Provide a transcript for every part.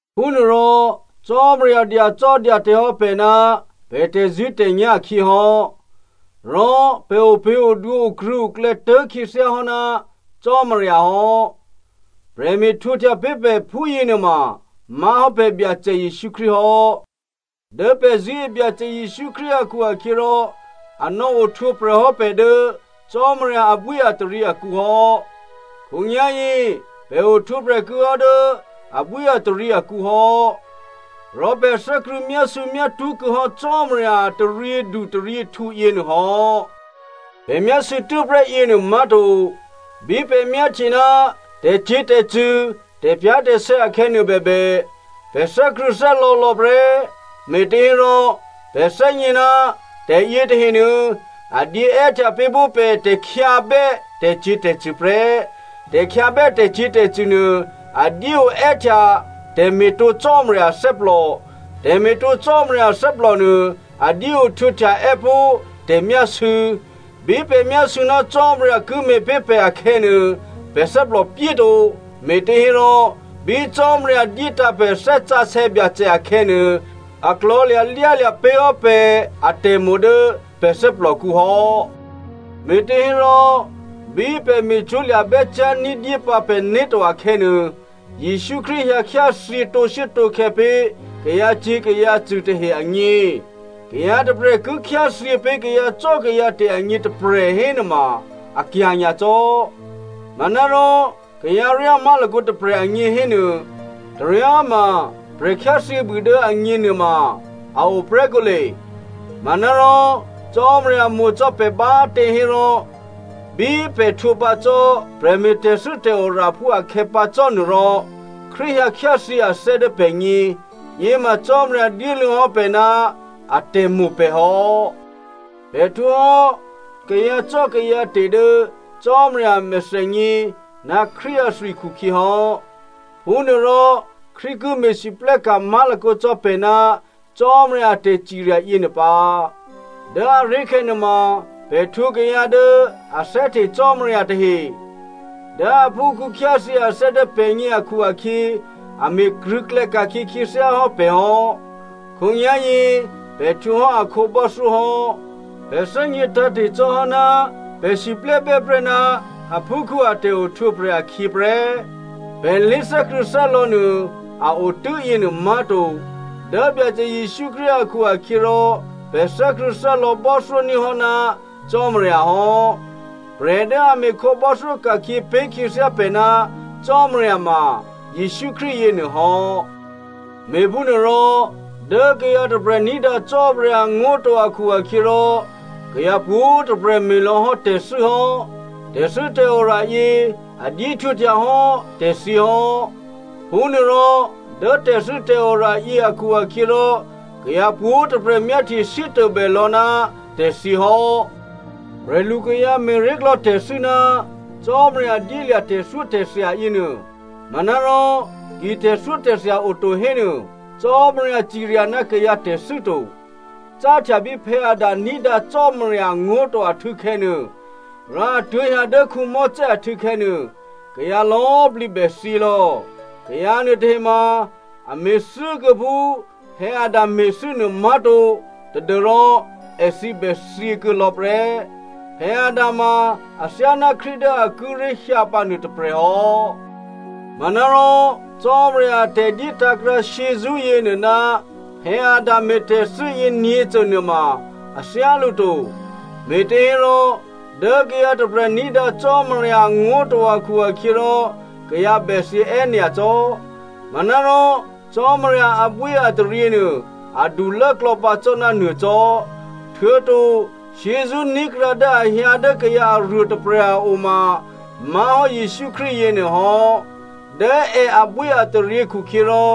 Phúnuôrò Cò́marya dyacò́dyate̤ hò́ pè̤ ná pè̤ tè̤zṳ̂́tè̤nyá̤ akhyě hò́. Rò pè̤ opě̤odwǒ okrṳ̂̌oklè̌ tố̤ khyěthyá hò́ ná Cò́marya hò́. Prè̤me̤ htwǒhtya pé̤ pè̤ phúyěnuôma má̤hò́ pè̤ Byacè Jesǔ Krístu hò́. Dố pè̤ zṳ̂́e Byacè Jesǔ Krístu akhu-akhyěrò, a nò̌ ohtwǒprè̤ hò́ pè̤ dố Cò́marya abwíataryě akǔ hò́. Khǒnyá̤yě pè̤ ohtwǒprè̤ kuô̌hò́ dố abwíataryě akǔ hò́. Rò pè̤ thè́krṳ̂̌ myásû̌myátṳ́ kuô̌ hò́ Cò́marya a taryědutaryěhtǔ yěnuô hò́. Pè̤ myásû̌ tû́prè́ yěnuô má̤to, bí pè̤ myáhtye ná tè̤cyě̤tè̤cṳ̂, tè̤pyá̤tè̤sè̌ akhè̌ nuôbèbè, pè̤ thè́krṳ̂̌thè́lò̌lò̌ prè́, me̤těhérò pè̤ thè́gně ná tè̤ yětahenuô a dyé è́htya pé̤ pó̤ pè̤ tè̤khyǎbè́ tè̤cyě̤tè̤cṳ̂ prè́. Tè̤khyǎbè́ tè̤cyě̤tè̤cṳ̂ nuô a dyé oè́htya tè̤me̤tǒ Cò́marya athè́plò, tè̤me̤tǒ Cò́marya athè́plò nuô, a dyé ohtwǒhtya è́pó̤ tè̤myásû̌. Bí pè̤ myásû̌ ná Cò́marya ki me̤pé̤ pè̤ akhè̌nuô, pè̤ thè́plòpyé to, me̤těhérò, bí Cò́marya dyétǎ̤ pè̤ Thè́ Sǎsè̌ Byacè akhè̌nuô, a klò̤̌lya̤ lyálya̤ pé̤hò́ pè̤ atè̤mo̤ dố pè̤ thè́plòkǔ hò́. Me̤těhérò, bí pè̤ me̤cwó̤ lya̤bè́ cyá̤ ní̤dyé pǎ pè̤né̤ to akhè̌nuô, Jesǔ Krístu hyǎkhyáthyě tǒshuốtǒkhè̌ pé̤ kayǎcyě̤ kayǎcṳ̂ tahe agně. Kayǎ tôprè̤ ki khyáthyě pé̤ kayǎcò́kayǎte̤ agně tôprè̤ hénuôma, akya̤ nyacò́. Manárò kayǎryá má̤lakǒ tôprè̤ agně hénuô, taryá꤮ ma prè̤ khyáthyěbû dố agně nuôma a o prè́ kǒle. Manárò Cò́marya mo̤ cò́ pè̤ bá꤮ tě hérò, bí pè̤ htwǒpǎ cò́ prè̤me̤tè̤thû́ tè̤oraphú akhè̌ pǎ cò́ nuôrò, Krístu hyǎkhyáthyě athè́ dố pè̤gně. Yěma Cò́marya dyéluô̌hò́ pè̤ ná atè̤mo̤ pè̤ hò́. Pè̤ htwǒhò́ kayǎcò́kayǎte̤ dố Cò́marya a mèthènyě ná Krístu athwi khukhyě hò́. Phúnuôrò Krístu ki me̤lwóhteka̤ má̤lakǒ cò́ pè̤ ná Cò́marya a tè̤cirya yěnuô pǎ. Dố aré̤khè̌ nuôma, pè̤ htwǒ kayǎ dố a thè́hte Cò́marya tahe. Dố aphúkhǔ khyáthyě athè́ dố pè̤gně akhu-akhyě, a me̤ krṳ̂̌klè̌ ka̤khyě khyěthyá hò́ pè̤ hò́. Khǒnyá̤yě pè̤ htwǒhò́ akhǒ bò́thyó hò́. Pè̤ thè́gně tǎ̤te̤ cò́hò́ ná pè̤ siplè́bè́ prè́ ná aphúkhǔ a tè̤ohtwǒprè̤ akhyě prè́. Pè̤ lé̤thè́krṳ̂̌thè́lò̌ nuô a o tû́yěnuô má̤to. Dố Byacè Jesǔ Krístu akhu-akhyěrò pè̤ thè́krṳ̂̌thè́lò̌ bò́thyóní̤ hò́ ná Cò́marya hò́. Prè̤ dố a me̤ khǒbò́thyó ka̤khyě pé̤ khyěthyá pè̤ ná Cò́marya ma Jesǔ Krístu yěnuô hò́. Me̤phúnuôrò, dố kayǎ tôprè̤ ní̤dǎ Cò́marya angó̤ to akhu-akhyěrò, kayǎ pwǒ̤꤮ tôprè̤ me̤lò̌ hò́ tè̤thû́ hò́. Tè̤thû́tè̤ora yě a dyéhtwǒhtya hò́ tè̤thyě hò́. Phúnuôrò dố tè̤thû́tè̤ora yě akhu-akhyěrò, kayǎ pwǒ̤꤮ tôprè̤ myáhtye sítôbè lò̌ ná tè̤thyě hò́. Prè̤lu kayǎ me̤ré̤klò̌ tè̤thû́ ná Cò́marya dyélya̤ tè̤thyótè̤thya yěnuô. Manárò ki tè̤thyótè̤thya oto hénuô Cò́marya cirya ná kayǎ tè̤thû́ to. Cáhtya bí Adam ní̤dǎ Cò́marya angó̤ to ahtû̌khè̌nuô, rò a tuố̤hyǎ dố Mosè ahtû̌khè̌ nuô, kayǎ lò̌꤮ plǐ bèthyělò̌. Kayǎ nuôtahe ma, a me̤thû́kuô̌ phú Adam me̤thû́ nuô má̤to tadû́rò èthǐ bèthyě kuô̌lò̌ prè́. Adam ma athyáná Krístu dố a kíré̤ hyǎpǎ nuôtôprè̤ hò́. Manárò Cò́marya a tè̤dyétǎ̤ krǎ shyězṳ́ yěnuô ná Adam me̤tè̤thû́ yěnyě̤cô nuôma a thyálǔ to. Me̤těhérò, dố kayǎ tôprè̤ ní̤dǎ Cò́marya angó̤ to akhu-akhyěrò, kayǎ bè thyě è́nyacò́. Manárò Cò́marya abwíataryě nuô adulố klò̌pǎ cò́ ná nuô cò́. Htuô̌to shyězṳ́ ní̤krǎ dố a hyǎ dố kayǎ aruô tôprè̤ a o ma má̤hò́ Jesǔ Krístu yěnuôhò́. Dố è abwíataryě khukhyěrò,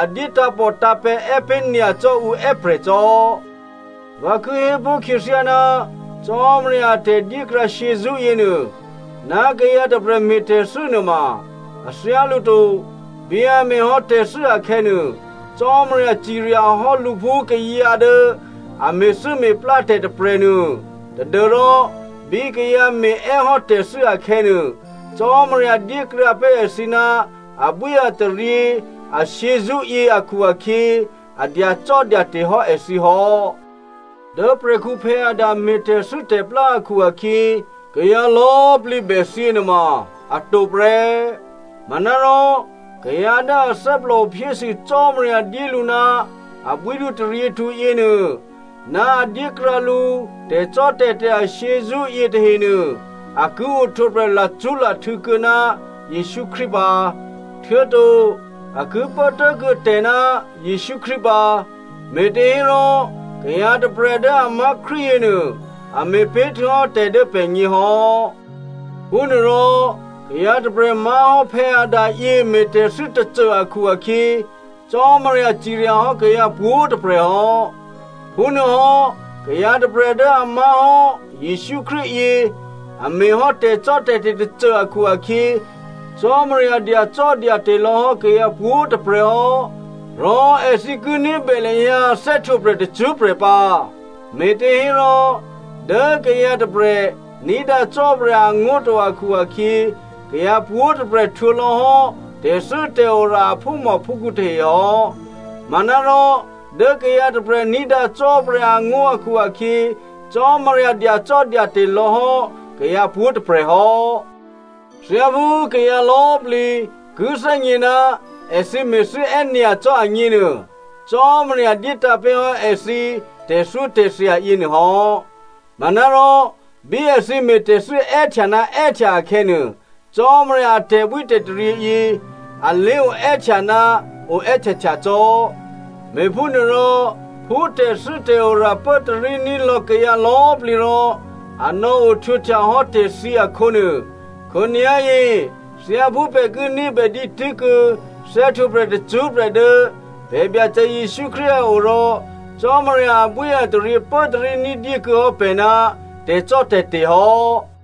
a dyé tǎ̤pòtǎ̤pè̤̌ è́ pé̤ nyacò́ ǔ è́prè̤ cò́. Vǎ ki hépó̤ khyěthyá, Cò́marya a tè̤dyékrǎ shyězṳ́ yěnuô, ná kayǎ tôprè̤ me̤tè̤thû́ nuôma a thyálǔ to. Bí a me̤hò́ tè̤thû́ akhè̌nuô, Cò́marya ciryahò́ lǔ phú kayǎ dố a me̤thû́me̤plá tè̤ tôprè̤nuô tadû́rò bí kayǎ me̤è́hò́ tè̤thû́ akhè̌nuô, Cò́marya dyékrǎ pé̤ èthǐ ná abwíataryě ashyězṳ́yě akhu-akhyě, a dyacò́dyate̤ hò́ èthǐ hò́. Dố prè̤khǔ Adam me̤ tè̤thû́tè̤plá akhu-akhyě kayǎ lò̌꤮ plǐ bèthyě nuôma atǒ prè́. Manárò kayǎ dố a thè́plòo phyésû Cò́marya dyé lǔ ná abwídu taryěhtǔ yěnuô ná a dyékrǎ lǔ tè̤cò́tè̤te̤ ashyězṳ́ yětahenuô, a ki ohtwǒprè̤ lacṳ́lahtû̌ kuô̌ ná Jesǔ Krístu pǎ, htuô̌to a ki pố tố̤kuô̌ tè̤ ná Jesǔ Krístu pǎ. Me̤těhérò kayǎ tôprè̤ dố a má̤ Krístu yěnuô, a me̤pé̤ htuô̌hò́ tè̤ dố pè̤gně hò́. Phúnuôrò kayǎ tôprè̤ má̤hò́ Adam yě me̤thû́tè̤ tôcô akhu-akhyě Cò́marya ciryahò́ kayǎ pwǒ̤꤮ tôprè̤ hò́. Phúnuôhò́, kayǎ tôprè̤ dố a má̤hò́ Jesǔ Krístu yě a me̤hò́ tè̤cò́tè̤te̤ tôcô akhu-akhyě, Cò́marya dyacò́dyate̤ lò̌hò́ kayǎ pwǒ̤꤮ tôprè̤ hò́, rò èthǐ ki ní̤bè lahyǎ thè́htwǒprè̤ tacṳ́prè̤ pǎ. Me̤těhérò dố kayǎ tôprè̤ ní̤dǎ Cò́marya angó̤ to akhu-akhyě, kayǎ pwǒ̤꤮ tôprè̤ htwǒlò̌ hò́ tè̤thû́tè̤ora a phúmòphúkhǔ tahe hò́. Manárò dố kayǎ tôprè̤ ní̤dǎ Cò́marya angó̤ akhu-akhyě, Cò́marya dyacò́dyate̤ lò̌hò́ kayǎ pwǒ̤꤮ tôprè̤ hò́. Thyáphú kayǎ lò̌꤮ plǐ ki thè́gně ná èthǐ me̤thû́ è́nyacò́ agněnuô, Cò́marya dyétǎ̤pé̤ hò́ èthǐ tè̤thyótè̤thya yěnuô hò́. Manárò bí èthǐ me̤tè̤thû́ è́htya ná è́htya akhè̌nuô, Cò́marya a tè̤bwítè̤taryě yě a lé oè́htya ná oè́htyahtya cò́. Me̤phúnuôrò, phú tè̤thû́tè̤ora pốtaríní̤ lò̌ kayǎ lò̌꤮ plǐ rò a nò̌ohtwǒhtya hò́ tè̤thyě akhǒnuô, khǒnyá̤yě thyáphú pè̤ ki ní̤bè dǐtû́kuô̌ thè́htwǒprè̤ tacṳ́prè̤ dố pè̤ Byacè Jesǔ Krístu a o rò, Cò́marya abwíataryě pốtarí ní̤dyé kuô̌ hò́ pè̤ ná tè̤cò́tè̤te̤ hò́.